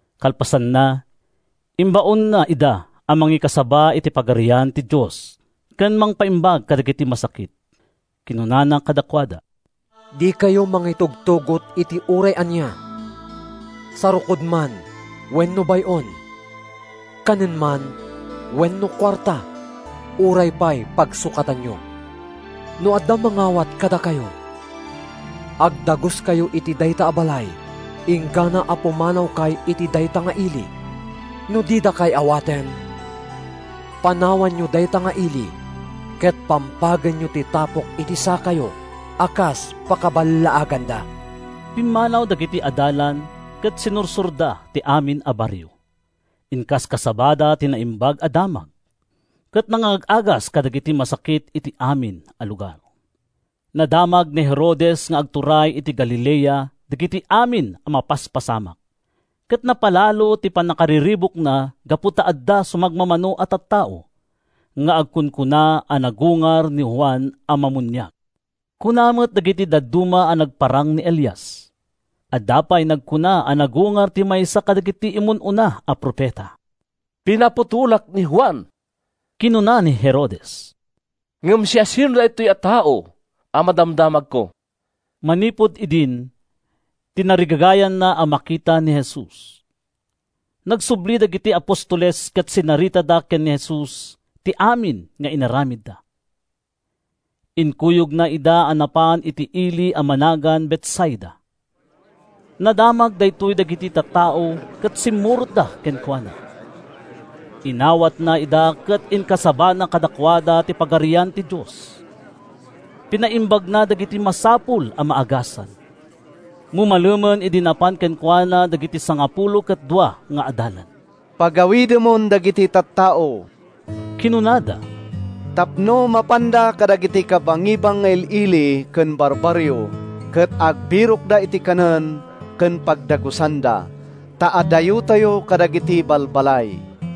Kalpasanna, imbaonna ida a mangikasaba iti Pagarian ti Dios ken mangpaimbag kadagiti masakit. Kinunana kadakuada, “Dikayo mangitugtugot iti uray ania, sarukod man wenno bay-on, kanen man wenno kuarta, uray pay pagsukatanyo. No adda mangawat kadakayo, agdaguskayo iti dayta a balay inggana a pumanawkay iti dayta nga ili. No didakay awaten, panawanyo dayta nga ili ket pampagenyo ti tapok iti sakayo a kas pakaballaaganda.” Pimmanaw dagiti adalan ket sinursorda ti amin a barrio. Inkaskasabada ti Naimbag a Damag, ken nangag-agasda kadagiti masakit iti amin a lugar. Nadamag ni Herodes nga agturay iti Galilea dagiti amin a mapaspasamak ket napalalo ti pannakariribukna gapu ta adda sumagmamano a tattao nga agkunkuna a nagungar ni Juan a Mammuniag. Kuna met dagiti dadduma a nagparang ni Elias. Adda pay nagkuna a nagungar ti maysa kadagiti immun-una a profeta. “Pinaputolak ni Juan,” kinuna ni Herodes, “ngem siasino daytoy a tao a madamdamagko?” Manipud idin, tinarigagayanna a makita ni Jesus. Nagsubli dagiti apostoles ket sinaritada ken ni Jesus ti amin nga inaramidda. Inkuyogna ida a napan iti ili a managan Betsaida. Nadamag daytoy dagiti tattao ket simmurotda kenkuana. Inawatna ida ket inkasabana kadakuada ti Pagarian ti Dios. Pinaimbagna dagiti masapul a maagasan. Mumalemen idi napan kenkuana dagiti sangapulo ket dua nga adalan. “Pagawidemon dagiti tattao,” kinunada, “tapno mapanda kadagiti kabangibang nga il-ili ken barbarrio ket agbirokda iti kanen ken pagdagusanda, ta adayotayo kadagiti balbalay.”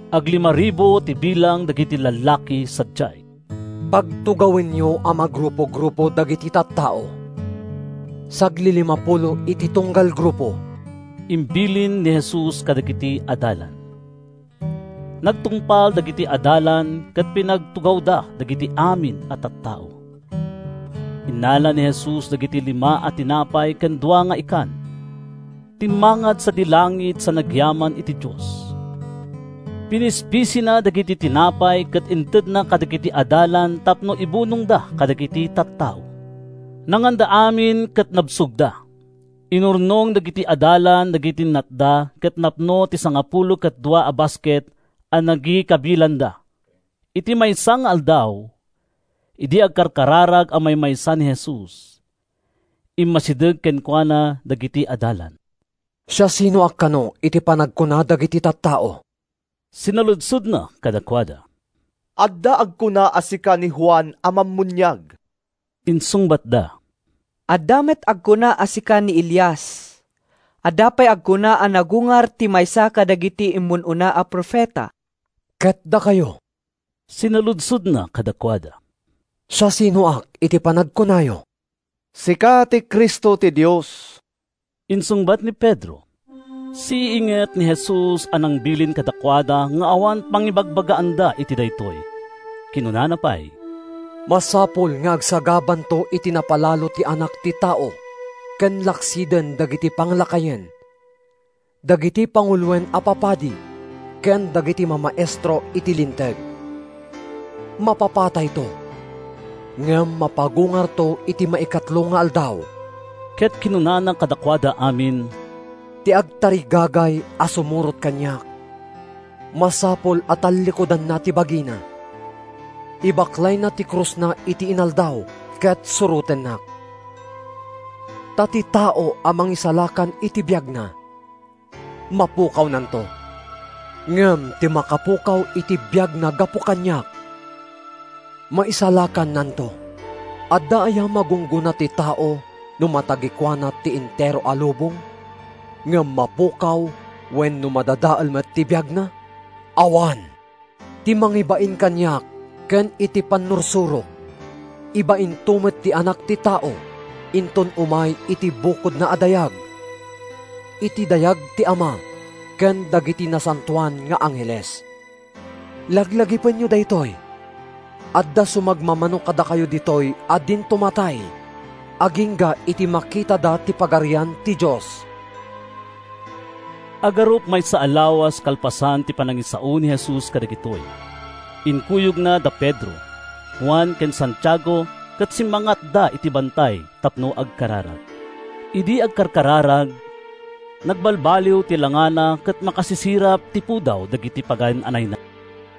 (Aglimaribu ti bilang dagiti lallaki sadiay.) “Pagtugawenyo a magrupo-grupo dagiti tattao; saglilimapulo iti tunggal grupo,” imbilin ni Jesus kadagiti adalan. Nagtungpal dagiti adalan ket pinagtugawda dagiti amin a tattao. Innala ni Jesus dagiti lima a tinapay ken dua nga ikan. Timmangad sadi langit sa nagyaman iti Dios. Pinispisina dagiti tinapay ket intedna kadagiti adalan tapno ibunongda kadagiti tattao. Nanganda amin ket nabsogda. Inurnong dagiti adalan dagiti natda ket napno ti sangapulo ket dua a basket a nagikabilanda. Iti maysa nga aldaw, idi agkarkararag a maymaysa ni Jesus, immasideg kenkuana dagiti adalan. “Siasinoak kano iti panagkuna dagiti tattao?” sinaludsodna kadakuada. “Adda agkuna a sika ni Juan a Mammuniag,” insungbatda. “Adda met agkuna a sika ni Elias. Adda pay agkuna a nagungar ti maysa kadagiti immun-una a profeta.” “Ket dakayo,” sinaludsodna kadakuada, “siasinoak iti panagkunayo?” “Sika ti Cristo ti Dios,” insungbat ni Pedro. Siiinget ni Jesus a nangbilin kadakuada nga awan pangibagbagaanda iti daytoy. Kinunana pay: “Masapul nga agsagabanto iti napalalo ti Anak ti Tao ken laksiden dagiti panglakayen, dagiti panguloen a papadi ken dagiti mamaestro iti Linteg. Mapapatayto, ngem mapagungarto iti maikatlo nga aldaw.” Ket kinunana kadakuada amin: “Ti agtarigagay a sumurot kaniak, masapul a tallikudanna ti bagina, ibaklayna ti krusna iti inaldaw, ket surotennak. Ta ti tao a mangisalakan iti biagna, mapukawnanto. Ngem ti makapukaw iti biagna gapu kaniak, maisalakannanto. Adda aya magunggona ti tao no matagikuana ti entero a lubong ngem mapukaw wenno madadael met ti biagna? Awan! Ti mangibain kaniak ken iti pannursurok, ibainto met ti Anak ti Tao inton umay iti bukodna a dayag, iti dayag ti Ama ken dagiti nasantoan nga angheles. Laglagipenyo daytoy: Adda sumagmamano kadakayo ditoy a dinto matay agingga iti makitada ti Pagarian ti Dios.” Agarup maysa a lawas kalpasan ti panangisao ni Jesus kadagitoy, inkuyogna da Pedro, Juan ken Santiago ket simmang-atda iti bantay tapno agkararag. Idi agkarkararag, nagbalbaliw ti langana ket makasisirap ti pudaw dagiti pagan-anayna.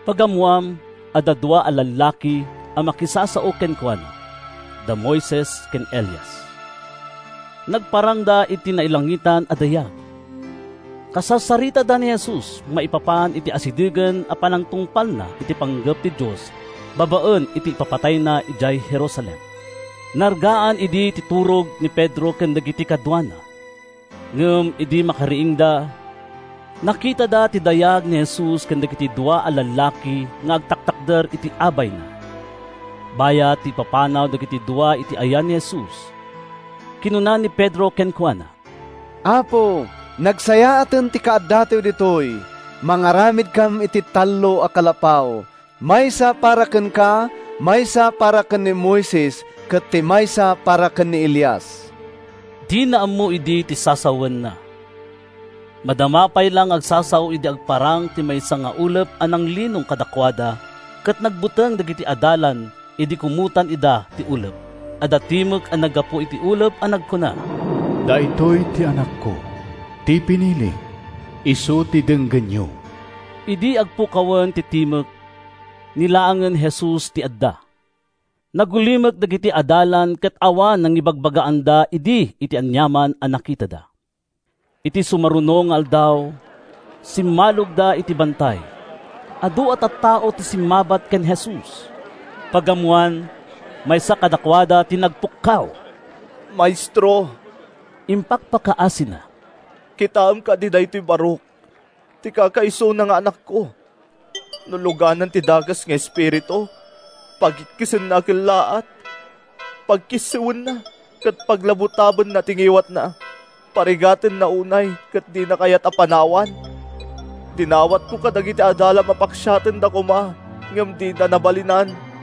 Pagammoan, adda dua a lallaki a makisasao kenkuana—da Moises ken Elias. Nagparangda iti nailangitan a dayag. Kasarsaritada ni Jesus maipapan iti asidegen a panangtungpalna iti panggep ti Dios babaen iti ipapatayna idiay Jerusalem. Nargaan idi ti turog ni Pedro ken dagiti kaduana, ngem idi makariingda, nakitada ti dayag ni Jesus ken dagiti dua a lallaki nga agtatakder iti abayna. Bayat ti ipapanaw dagiti dua iti yan ni Jesus, kinuna ni Pedro kenkuana: “Apo, nagsayaaten ti kaaddatayo ditoy! Mangaramidkam iti tallo a kalapaw: maysa para kenka, maysa para ken ni Moises, ket ti maysa para ken ni Elias.” (Dina ammo idi ti sasawenna.) Madama pay la nga agsasao idi agparang ti maysa nga ulep a nanglinong kadakuada ket nagbuteng dagiti adalan idi kumotan ida ti ulep. Adda timek a naggapu iti ulep a nagkuna: “Daytoy ti Anakko, ti pinilik. Isu ti denggenyo.” Idi agpukawen ti timek, ni laengen Jesus ti adda. Nagulimek dagiti adalan ket awan nangibagbagaanda idi iti aniaman a nakitada. Iti sumaruno nga aldaw, simmalogda iti bantay. Adu a tattao ti simmabat ken Jesus. Pagammoan, maysa kadakuada ti nagpukkaw. “Maestro,” impakpakaasina, “kitaem kadi daytoy barok, ti kakaisuna nga anakko. No luganan ti dakes nga espiritu, pagikkisenna a kellaat, pagkissiwenna ket paglabutabenna ti ngiwatna. Parigatenna unay ket dina kayat a panawan. Dinawatko kadagiti adalam a paksiatenda koma, ngem dida nabalinan.”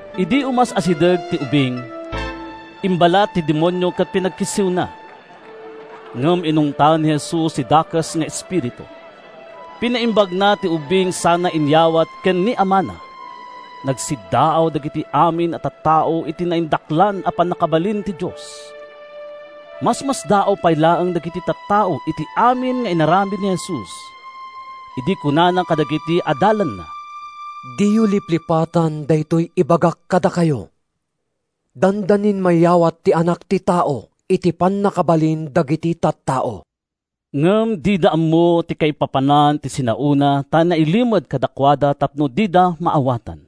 Idi umas-asideg ti ubing, imbalat ti demonio ket pinagkissiwna. Ngem inungtan ni Jesus ti dakes nga espiritu, pinaimbagna ti ubing sana inyawat ken ni amana. Nagsiddaaw dagiti amin a tattao iti naindaklan a pannakabalin ti Dios. Masmasdaaw pay laeng dagiti tattao iti amin nga inaramid ni Jesus, idi kunana kadagiti adalanna, “Diyo liplipatan daytoy ibagak kadakayo: Dandanin mayawat ti Anak ti Tao iti pannakabalin dagiti tattao.” Ngem dida ammo ti kaipapanan ti sinaona ta nailimed kadakuada tapno dida maawatan.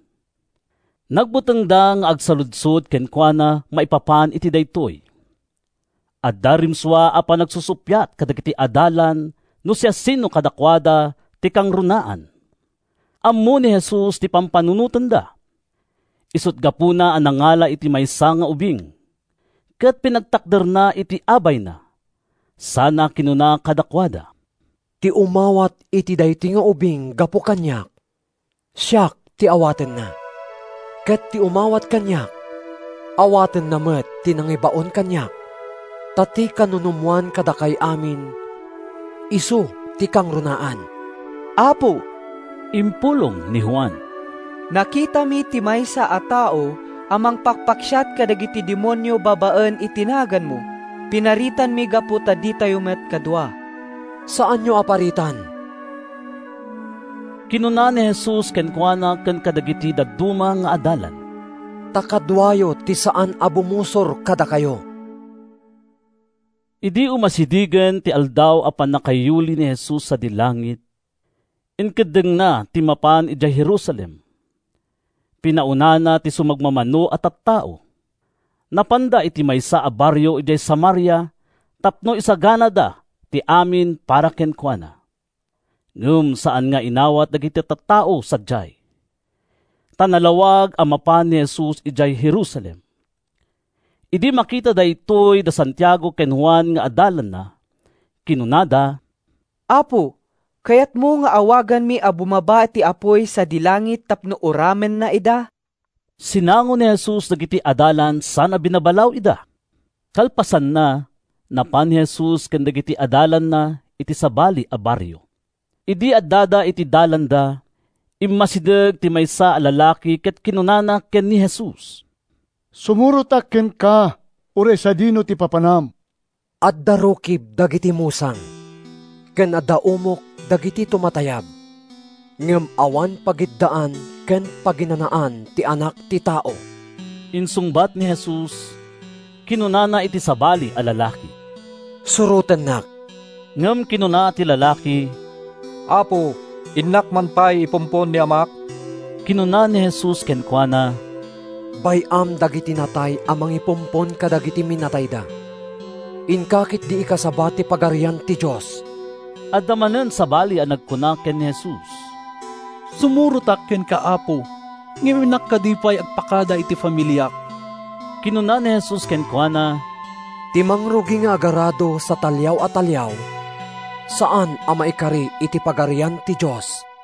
Nagbutengda nga agsaludsod kenkuana maipapan iti daytoy. Adda rimsua a panagsusuppiat kadagiti adalan no siasino kadakuada ti kangrunaan. Ammo ni Jesus ti pampanunotenda, isut’ gapuna a nangala iti maysa nga ubing, ket pinagtakderna iti abayna sana kinuna kadakuada, “Ti umawat iti daytoy nga ubing gapu kaniak, siak ti awatenna. Ket ti umawat kaniak, awatenna met ti nangibaon kaniak. Ta ti kanunumoan kadakay amin, isu ti kangrunaan.” “Apo,” impulong ni Juan, “nakitami ti maysa a tao a mangpakpaksiat kadagiti demonio babaen iti naganmo. Pinaritanmi gapu ta ditayo met kadua.” “Saanyo a paritan,” kinuna ni Jesus kenkuana ken kadagiti dadduma nga adalan, “ta kaduayo ti saan a bumusor kadakayo.” Idi umasidegen ti aldaw a pannakayuli ni Jesus sadi langit, inkeddengna ti mapan idiay Jerusalem. Pinaunana ti sumagmamano a tattao. Napanda iti maysa a barrio idiay Samaria tapno isaganada ti amin para kenkuana. Ngem saan nga inawat dagiti tattao sadiay, ta nalawag a mapan ni Jesus idiay Jerusalem. Idi makita daytoy da Santiago ken Juan nga adalanna, kinunada, “Apo, kayatmo nga awaganmi a bumaba ti apuy sadi langit tapno uramenna ida?” Sinango ni Jesus dagiti adalan sana binabalaw ida. Kalpasanna, napan ni Jesus ken dagiti adalanna iti sabali a barrio. Idi addada iti dalanda, immasideg ti maysa a lalaki ket kinunana ken ni Jesus, “Sumurotak kenka, uray sadino ti papanam.” “Adda rukib dagiti musang, ken adda umok dagiti tumatayab, ngem awan pagiddaan ken paginanaan ti Anak ti Tao,” insungbat ni Jesus. Kinunana iti sabali a lalaki, “Surotennak.” Ngem kinuna ti lalaki, “Apo, innak man pay ipumpon ni amak.” Kinuna ni Jesus kenkuana, “Bay-am dagiti natay a mangipumpon kadagiti minatayda. Inka ketdi ikasaba ti Pagarian ti Dios.” Adda manen sabali a nagkuna ken ni Jesus, “Sumurotak kenka, Apo, ngem innak kadi pay agpakada iti familiak.” Kinuna ni Jesus kenkuana, “Ti mangrugi nga agarado sa taliaw a taliaw, saan a maikari iti Pagarian ti Dios.”